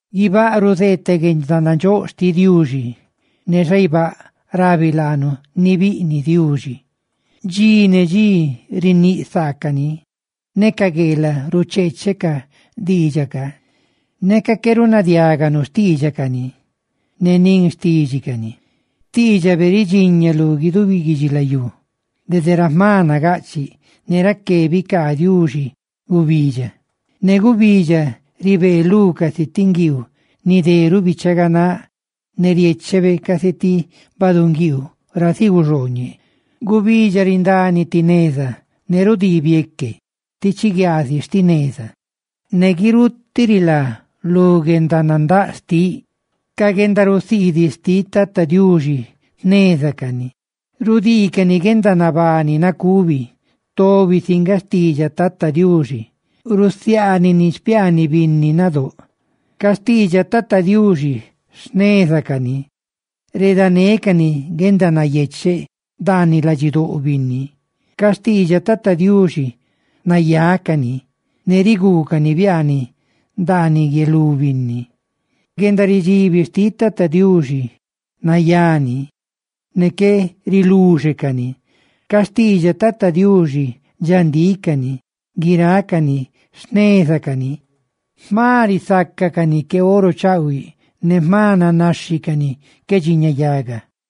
Guibáꞌ ruzeeteꞌ guendanandxóꞌ xtiꞌ Diuxi; ne xaibáꞌ, rabi laanu ni biꞌniꞌ Diuxi. Dxi ne dxi riníꞌ saacani; ne ca gueelaꞌ rucheeche ca diidxaꞌ ca. Neca qué runadiáganu xtiidxacani, ne nin xtídxicani, xtiidxabe ridxiña lu guidubi guidxilayú, dede ra jma nagaꞌchiꞌ. Ne raqué bicaa Diuxi gubidxa, ne gubidxa ribee lú casi ti nguiiu ni deruꞌ bichaganáꞌ, ne riéchebe casi ti baꞌdunguiiu ra ziguxooñe. Gubidxa rindani ti neza, ne rudii bieque, ti chiguiaazi sti neza, ne guirutiꞌ rilá lu guendanandáꞌ xtiꞌ. Ca guendarusiidiꞌ xtiꞌ Tata Diuxi jneza cani, rudiicani guendanabani nacubi. Tobi si nga xtiidxaꞌ Tata Diuxi, rusiaanini xpiaaniꞌ binni nadóꞌ. Ca xtiidxaꞌ Tata Diuxi jneza cani, redanécani guendanayecheꞌ ndaaniꞌ ladxidóꞌ binni. Ca xtiidxaꞌ Tata Diuxi nayá cani, ne riguucani biaaniꞌ ndaaniꞌ guie lú binni. Guendaridxibi xtiꞌ Tata Diuxi nayá ni, ne qué riluxe ni. Ca xtiidxaꞌ Tata Diuxi, dxandíꞌ cani, guirácani jneza cani, ¡jma risacacani que oro chaꞌhuiꞌ!, ¡ne jma nanaxhicani que dxiñayaga!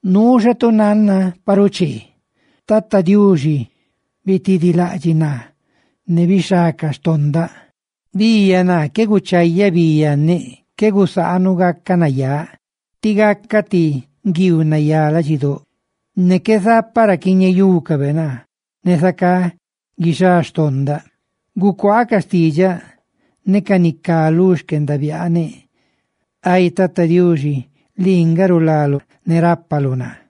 Nuu xa tu nanna pa ruchee, ¡Tata Diuxi bitidilaꞌdxiꞌ naa, ne bixhá ca donda nagaꞌchiꞌ xtinneꞌ! Biiyaꞌ naa qué guchayaꞌ bi yanneꞌ; qué gusaanuꞌ gacaꞌ nayáꞌ. Tí gacaꞌ ti nguiiu nayá ladxidóꞌ, ne qué zapaꞌ ra quiñeyúcabe naa; ne zacá guixá xtondaꞌ. Gucuaa ca xtiidxaꞌ ne ca ni cá lu xquendabiaaneꞌ, Ay Tata Diuxi, lii nga rulaluꞌ ne rápaluꞌ naa.